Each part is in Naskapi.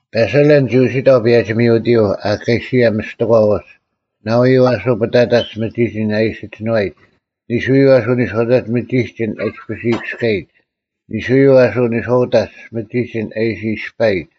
ᐸᓴᓕᓪ ᒋ ᐅᓯᑕᐤ ᐸᔭᒋ-ᒥᐅᑎᔪᐤ ᐊᑲᓯᔭ ᒥᔅᑎᒂ ᐅᒡ ᓇᐎᔪᐤ ᐊᓱ ᐱᑕᑕᒡ ᒥᒋᒋᓐ ᐊ ᐃᓯ ᒋᓏᔨᒡ, ᓂᓱᔪᐤ ᐊᓱ ᓂᔄᐅᑕᒡ ᒥᒋᒋᓐ ᐊ ᐃᔅᐱᔅ ᐃᔨᑭᔅᑲᔨᒡ, ᓂᓱᔪᐤ ᐊᓱ ᓂᔄᐅᑕᒡ ᒥᒋᒋᓐ ᐊ ᐃᓯ ᐃᔅᐸᔨᒡ᙮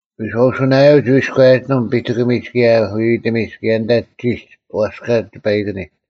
ᐎᔄᐅᓱᓇᔭᔪᐤ ᒋ ᐎᔎᔭᒋᓂᒻ ᐱᑎᑭᒥᒡ ᑭᔭ ᐎᐎᑎᒥᒡ ᑭᔭ ᐊᓐᑕ ᒋᒡ ᐛᔅᑲ ᒋᐸᐃᑭᓂᒡ᙮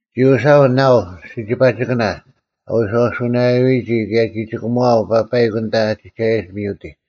ᒋ ᐅᓯᐊᐤ ᓇᐤ ᓯᒋᐸᒋᑭᓇ ᐊ ᐎᔄᐅᓱᓇᔭᐎᔨᒋ ᑭᔭ ᒋ ᒋᑭᒧᐛᐤ ᐸᐸᐃᒄ ᐊᓐᑕ ᐊ ᒋᒐᔭᒡ ᒥᐅᑎᒡ᙮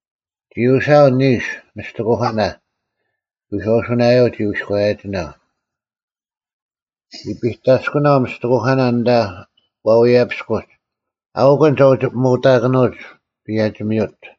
ᒋ ᐅᓯᐊᐤ ᓂᓱ ᒥᔅᑎᑯᐧᑲᓇ, ᐎᔄᐅᓱᓇᔭᔪᐤ ᒋ ᐎᔎᔭᒋᓇᐤ᙮ ᒋ ᐱᑕᔅᑯᓄᐤ ᒥᔅᑎᑯᐧᑲᓇ ᐊᓐᑕ ᐛᐎᔭᐱᔅᑯᒡ, ᐊᐅᑯᓐ ᒐ ᐅᒋ ᐱᒧᑕᐧᑯᓂᑭᓄᐅᒡ ᐸᔭᒋ-ᒥᐅᑦ᙮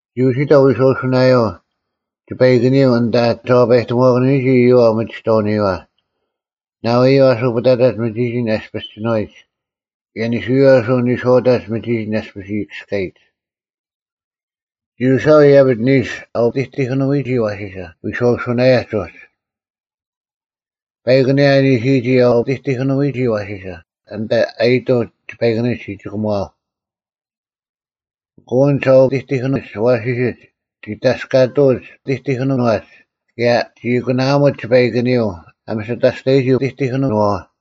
ᒋ ᐅᓯᑕᐤ ᐎᔄᐅᓱᓇᔭᐤ ᒋᐸᐃᑭᓂᔪᐤ ᐊᓐᑕ ᒐ ᐛᐸᔨᑎᒧᐛᑭᓄᐎᒋ ᐃᔪᐛ ᐅᒥᒋᑐᑎᒧᐅᓂᔪᐛ᙮ ᓇᐎᔪᐤ ᐊᓱ ᐱᑕᑕᒡ ᒥᒋᒋᓐ ᐊ ᐃᔅᐱᔅ ᒋᓏᔨᒡ ᑭᔭ ᓂᓱᔪᐤ ᐊᓱ ᓂᔄᐅᑕᒡ ᒥᒋᒋᓐ ᐃᔅᐱᔅ ᐃᔨᑭᔅᑲᔨᒡ᙮ ᒋ ᐅᓯᐊᐤ ᐃᔭᐱᒡ ᓂᓱ ᐊ ᐅᑎᑎᑭᓄᐎᒋ ᐊᐛᓯᓴ ᐎᔄᐅᓱᓇᔭᒡ ᐅᒡ᙮ ᐸᐃᒄ ᐊᓂᔭ ᐊ ᓂᓯᔨᒋ ᐊ ᐅᑎᑎᑭᓄᐎᒋ ᐊᐛᓯᓴ ᐊᓐᑕ ᐊᔨᑐᐤ ᒋᐸᐃᑭᓂᒡ ᒋᒋᑭᒧᐊᐤ, ᐊᑯ ᐊᓐᒡ ᐊ ᐅᑎᑎᑭᓂᒡ ᐊᐛᓯᓯᒡ ᒋ ᑕᔅᑲᑐᐅᒡ ᐅᑎᑎᑭᓄᐛᒡ ᑭᔭ ᒋ ᐊᑯᓇᐊᒧᒡ ᒋᐸᐃᑭᓂᔪᐤ ᐊ ᒥᓯᑕᔅᑕᔨᒋ ᐅᑎᑎᑭᓄᐛᐛ᙮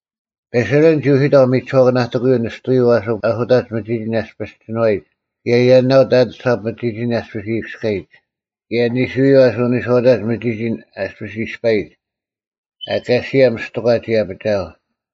ᐱᓴᓕᓪ ᒋ ᐅᓯᑕᐤ ᒥᒋᓱᐛᑭᓇᑎᑯᔪᐤ ᓂᔅᑐᐎᔪᐤ ᐊᓱ ᐊᓱᑕᒡ ᒥᒋᒋᓐ ᐊᔅᐱᔅ ᒋᓏᔨᒡ ᑭᔭ ᔭᓇᐤ ᑕᑐᓴᑉ ᒥᒋᒋᓐ ᐊᔅᐱᔅ ᐃᔨᑭᔅᑲᔨᒡ, ᑭᔭ ᓂᓱᐎᔪᐤ ᐊᓱ ᓂᔄᐅᑕᒡ ᒥᒋᒋᓐ ᐊᔅᐱᔅ ᐃᔅᐸᔨᒡ᙮ ᐊᑲᓯᔭ ᒥᔅᑎᒂ ᒋ ᐊᐱᒋᐊᐤ᙮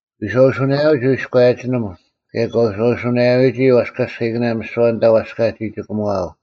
ᐎᔄᐅᓱᓇᔭᔪᐤ ᒋ ᐎᔎᔭᒋᓂᒻ ᑭᔭ ᑲ ᐎᔄᐅᓱᓇᔭᐅᔨᒋ ᐛᔅᑲᔅᑲᐃᑭᓇ ᒥᓯᐛ ᐊᓐᑕ ᐛᔅᑲ ᒋ ᒋᑭᒺᐊᐤ᙮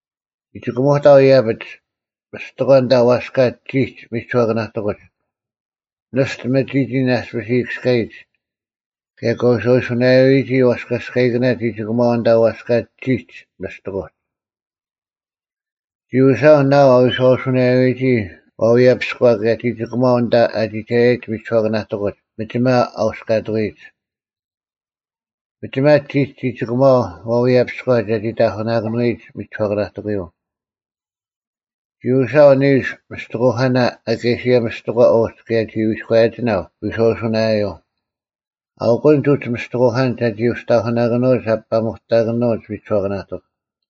ᒋ ᒋᑭᒧᑕᐤ ᐃᔭᐱᒡ ᒥᔅᑎᒂ ᐊᓐᑕ ᐛᔅᑲ ᒋᒡ ᒥᒋᓱᐛᑭᓇᑎᑯᒡ, ᓂᔅᑐ ᒥᒋᒋᓐ ᐊᔅᐱᔅ ᐃᔨᑭᔅᑲᔨᒡ, ᑭᔭ ᑲ ᐎᔄᐅᓱᓇᔭᐅᔨᒋ ᐛᔅᑲᔅᑲᐃᑭᓇ ᒋ ᒋᑯᒺᐊᐤ ᐊᓐᑕ ᐛᔅᑲ ᒋᒡ ᒥᔅᑎᑯᒡ᙮ ᒋ ᐅᓯᐊᐤ ᓇᐤ ᐊ ᐎᔄᐅᓱᓇᔭᐅᔨᒋ ᐛᐎᔭᐱᔎ ᑭᔭ ᒋ ᒋᑭᒺᐊᐤ ᐊᓐᑕ ᐊ ᒋᒐᔭᔨᒡ ᒥᒋᓱᐛᑭᓇᑎᑯᒡ ᒥᒋᒪ ᐊ ᐅᔅᑲᑐᐎᔨᒡ᙮ ᒥᒋᒪ ᒋᒡ ᒋ ᒋᑭᒺᐊᐤ ᐛᐎᔭᐱᔎ ᒐᒋ ᑕᐧᑯᓇᑭᓄᐎᔨᒡ ᒥᒋᓱᐛᑭᓇᑎᑯᔪᐤ᙮ ᒋ ᐅᓯᐊᐤ ᓂᓱ ᒥᔅᑎᑯᐧᑲᓇ ᐊᑲᓯᔭ ᒥᔅᑎᒂ ᐅᒡ ᑭᔭ ᒋ ᐎᔎᔭᒋᓇᐤ ᐎᔄᐅᓱᓇᔭᔪᐤ, ᐊᐅᑯᓐᒡ ᐅᒡ ᒥᔅᑎᑯᐧᑲᓐᒡ ᒐᒋ ᐅᒋ ᑕᐧᑯᓂᑭᓄᐅᒡ ᐊ ᐱᐸᒧᑕᑭᓄᐅᒡ ᒥᒋᓱᐛᑭᓇᑎᒄ᙮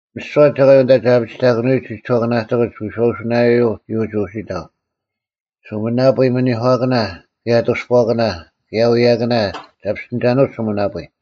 ᒥᓯᐛ ᒐᒂᔪᐤ ᐊᓐᑕ ᒐ ᐊᐱᒋᑕᑭᓄᐎᒡ ᒥᒋᓱᐛᑭᓇᑎᑯᒡ ᐎᔄᐅᓱᓇᔭᔪᐤ ᒋ ᐅᒋ ᐅᓯᑕᐤ: ᓱᒥᓇᐳᔾ ᒥᓂᒂᑭᓇ ᑭᔭ ᐊᑐᔅᐳᐛᑭᓇ ᑭᔭ ᐎᔭᑭᓇ ᒐ ᐱᔅᑎᓂᒐᓄᐅᒡ ᓱᒥᓇᐳᔾ᙮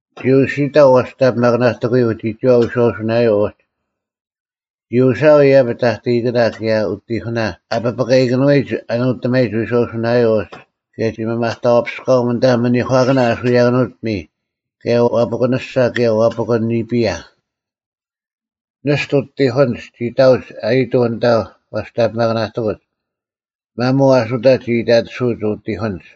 ᒋ ᐅᓯᑕᐤ ᐛᔅᑕᓂᐱᒪᑭᓇᑎᑯᔪᐤ ᒋᒋᐛ ᐎᔄᐅᓱᓇᔭᔪᐤ ᐅᒡ᙮ ᒋ ᐅᓯᐊᐤ ᐃᔭᐱᒡ ᑕᑕᐃᑭᓇ ᑭᔭ ᐅᑎᐧᑯᓇ ᐊ ᐱᐱᑲᐃᑭᓄᐎᒡ ᐊ ᓄᑎᒪᔨᒡ ᐎᔄᐅᓱᓇᔭᔪᐤ ᐅᒡ ᑭᔭ ᒋ ᒥᒪᑕᐛᐱᔅᑲᐊᒻ ᐊᓐᑕ ᒥᓂᒂᑭᓇ ᐊᓱᔭᑭᓄᐅᑦ ᐱᒥᔾ ᑭᔭ ᐛᐱᑯᓂᔅᒐ ᑭᔭ ᐛᐱᑯᓐ ᓂᐱᔭ᙮ ᓂᔅᑐ ᐅᑎᐧᑯᓐᒡ ᒋ ᑕᐅᒡ ᐊᔨᑐᐤ ᐊᓐᑕ ᐛᔅᑕᓂᐱᒪᑭᓇᑎᑯᒡ᙮ ᒪᒧᐤ ᐊᓱᑕᒡ ᒋ ᐃᑕᑎᓱᐅᒡ ᐅᑎᐧᑯᓐᒡ᙮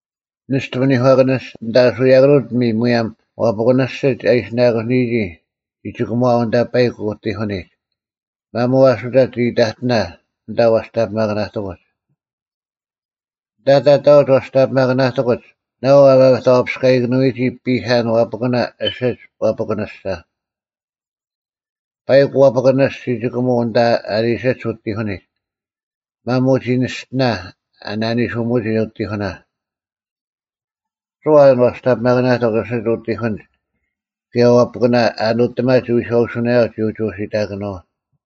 ᓂᔅᑐ ᒥᓂᒂᑭᓂᔅᒐ ᐊᓐᑕ ᐊᓱᔭᑭᓄᐅᑦ ᐱᒥᔾ ᒧᔭᒻ ᐛᐱᑯᓂᓯᒡ ᐊ ᐃᓯᓇᑯᓂᔨᒋ ᒋ ᒋᑭᒧᐛ ᐊᓐᑕ ᐸᐃᒄ ᐅᑎᐧᑯᓂᒡ᙮ ᒪᒧᐤ ᐊᓱᑕᒡ ᒋ ᐃᑕᑎᓇ ᐊᓐᑕ ᐛᔅᑕᓂᐱᒪᑭᓇᑎᑯᒡ᙮ ᐊᓐᑕ ᑕᑕᐅᒡ ᐛᔅᑕᓂᐱᒪᑭᓇᑎᑯᒡ ᓇᐤ ᐊ ᒥᒪᑕᐛᐱᔅᑲᐃᑭᓄᐅᒋ ᐱᑲᓐ ᐛᐱᑯᓇ ᐊᓯᒡ ᐛᐱᑯᓂᔅᒐ᙮ ᐸᐃᒃ ᐛᐱᑯᓂᔅᒡ ᒋ ᒋᑭᒧᐤ ᐊᓇᒡ ᐊ ᓂᓯᒡ ᐅᑎᐧᑯᓂᒡ᙮ ᒪᒧᐤ ᒋ ᓂᔅᑎᓇ ᐊ ᓇᓂᓱᒧᒋ ᐅᑎᐧᑯᓇ᙮ ᒥᓯᐛ ᐊᓐ ᐛᔅᑕᓂᐱᒪᑭᓇᑎᒄ ᐊᓯᒡ ᐅᑎᐧᑯᓐᒡ ᑭᔭ ᐛᐱᑯᓇ ᐊ ᓄᑎᒪᒡ ᐎᔄᐅᓱᓇᔭᐤ ᒋ ᐅᒋ ᐅᓯᑕᑭᓄᐤ᙮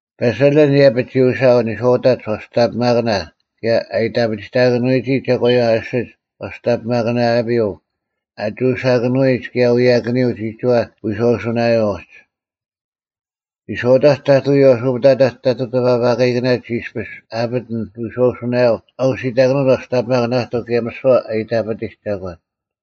ᐸᓴᓚᓪ ᐃᔭᐱᒡ ᒋ ᐅᓯᐊᐤ ᓂᔄᐅᑕᒡ ᐛᔅᑕᓂᐱᒪᑭᓇ ᑭᔭ ᐊ ᐃᑕᐱᒋᑕᑭᓄᐎᒋ ᒐᒂᔪᐛ ᐊᓯᒡ ᐛᔅᑕᓂᐱᒪᑭᓇᔭᐱᔪᐤ ᐊᒍᓴᑭᓄᐎᒡ ᑭᔭ ᐎᔭᑭᓂᔪᐤ ᒋᒋᐛ ᐎᔄᐅᓱᓇᔭᔪᐤ ᐅᒡ᙮ ᓂᔄᐅᑕᒡ ᑕᑐᔪᐤ ᐊᓱ ᐱᑕᑕᒡ ᑕᑐᐤ ᑎᐸᐸᑲᐃᑭᓇ ᒋ ᐃᔅᐱᔅ ᐊᐱᑎᓐ ᐎᔄᐅᓱᓇᔭᐤ ᐊ ᐅᓯᑕᑭᓄᐅᒡ ᐛᔅᑕᓂᐱᒪᑭᓇᑎᒄ ᑭᔭ ᒥᓯᐛ ᐊ ᐃᑕᐱᑎᒡ ᒐᒂᓐ᙮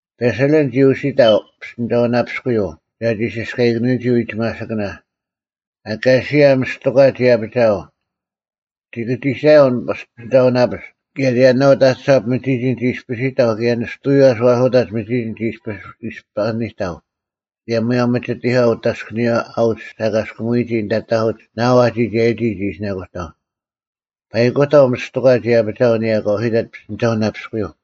ᐱᓴᓕᓪ ᒋ ᐅᓯᑕᐤ ᐱᔅᑎᓂᒐᐅᓇᐱᔅᑯᔪᐤ ᒐᒋ ᓯᔅᑲᐃᑭᓂᔨᒋ ᐎᒋᒪᓯᑭᓇ, ᐊᑲᓯᐊ ᒥᔅᑎᒂ ᒋ ᐊᐱᒋᐊᐤ᙮ ᒋ ᑭᒋᒐᔭᐤ ᐊᓐ ᐱᔅᑎᓂᒐᐅᓇᐱᔅᒄ ᑭᔭ ᔭᓇᐅᑕᑐᓴᑉ ᒥᒋᒋᓐ ᒋ ᐃᔅᐱᓯᑕᐤ ᑭᔭ ᓂᔅᑐᔪᐤ ᐊᓱ ᐊᓱᑕᒡ ᒥᒋᒋᓐ ᒋ ᐃᔅᐱᔅ ᐃᔅᐸᓂᑕᐤ ᑭᔭ ᒧᔭᒻ ᒥᒋᑎᒂ ᐅᑦ ᐊᔅᑭᓂᔨᐛ ᐊᐅᒡ ᓴᑲᔅᑯᒧᔨᒋ ᐊᓐᑕ ᑕᐧᑯᒡ ᓇᐤ ᐊ ᒋᒐᔭᔨᒋ ᒋ ᐃᓯᓇᑯᑕᐤ᙮ ᐸᐃᑯᑕᐤ ᒥᔅᑎᒂ ᒋ ᐊᐱᒋᐊᐤ ᐊᓂᔭ ᑲ ᐅᓯᑕᑦ ᐱᔅᑎᓂᒐᐅᓇᐱᔅᑯᔪᐤ᙮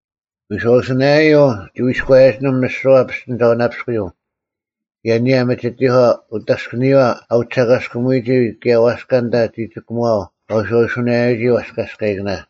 ᐎᔄᐅᓱᓇᔭᐤ ᒋ ᐎᔅᑯᔭᒋᓂᒻ ᒥᓯᐛ ᐱᔅᑎᓂᒐᐅᓇᐱᔅᑯᔪᐤ ᑭᔭ ᐊᓂᔭ ᒥᒋᑎᒂ ᐅᑦ ᐊᔅᑭᓂᔨᐛ ᐊᐅᒡ ᓴᑲᔅᑯᒧᔨᒋ ᑭᔭ ᐛᔅᑲ ᐊᓐᑕ ᒋᒋᑭᒺᐊᐤ ᑲ ᐎᔄᐅᓱᓇᔭᐎᒋ ᐛᔅᑲᔅᑲᐃᑭᓇ᙮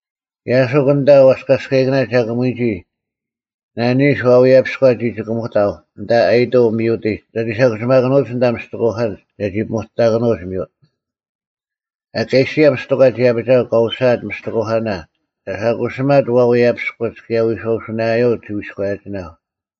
ᔭᓯᒄ ᐊᓐᑕ ᐛᔅᑲᔅᑲᐃᑭᓇ ᒐᑯᒧᐎᔨᒋ, ᓇᓂᓱ ᐛᐎᔭᐱᔎ ᒋ ᒋᑭᒧᑕᐤ ᐊᓐᑕ ᐊᔨᑐᐤ ᒥᐅᑎᒡ ᒐᒋ ᓴᑯᓯᒪᑭᓄᐅᒡ ᐊᓐᑕ ᒥᔅᑎᑯᐧᑲᓐᒡ ᒐᒋ ᐱᐸᒧᑕᑭᓄᐅᒡ ᒥᐅᑦ᙮ ᐊᑲᓯᔭ ᒥᔅᑎᒂ ᒋ ᐊᐱᒋᐊᐤ ᑲ ᐅᓯᐊᑦ ᒥᔅᑎᑯᐧᑲᓇ ᒐ ᓴᑯᓯᒪᑦ ᐛᐎᔭᐱᔅᑯᒡ ᑭᔭ ᐎᔄᐅᓱᓇᔭᔪᐤ ᒋ ᐎᔎᔭᒋᓇᐤ᙮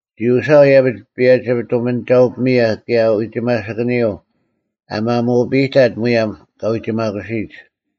ᒋ ᐅᓯᐊᐤ ᐃᔭᐱᒡ ᐸᔭᒋ ᑐᒥᓂᒐᐅ-ᐱᒥᔭ ᑭᔭ ᐎᒋᒪᓯᑭᓂᔪᐤ ᐊ ᒪᒧᐱᔨᑕᑦ ᒧᔭᒻ ᑲᐎᒋᒪᑯᓯᔨᒡ᙮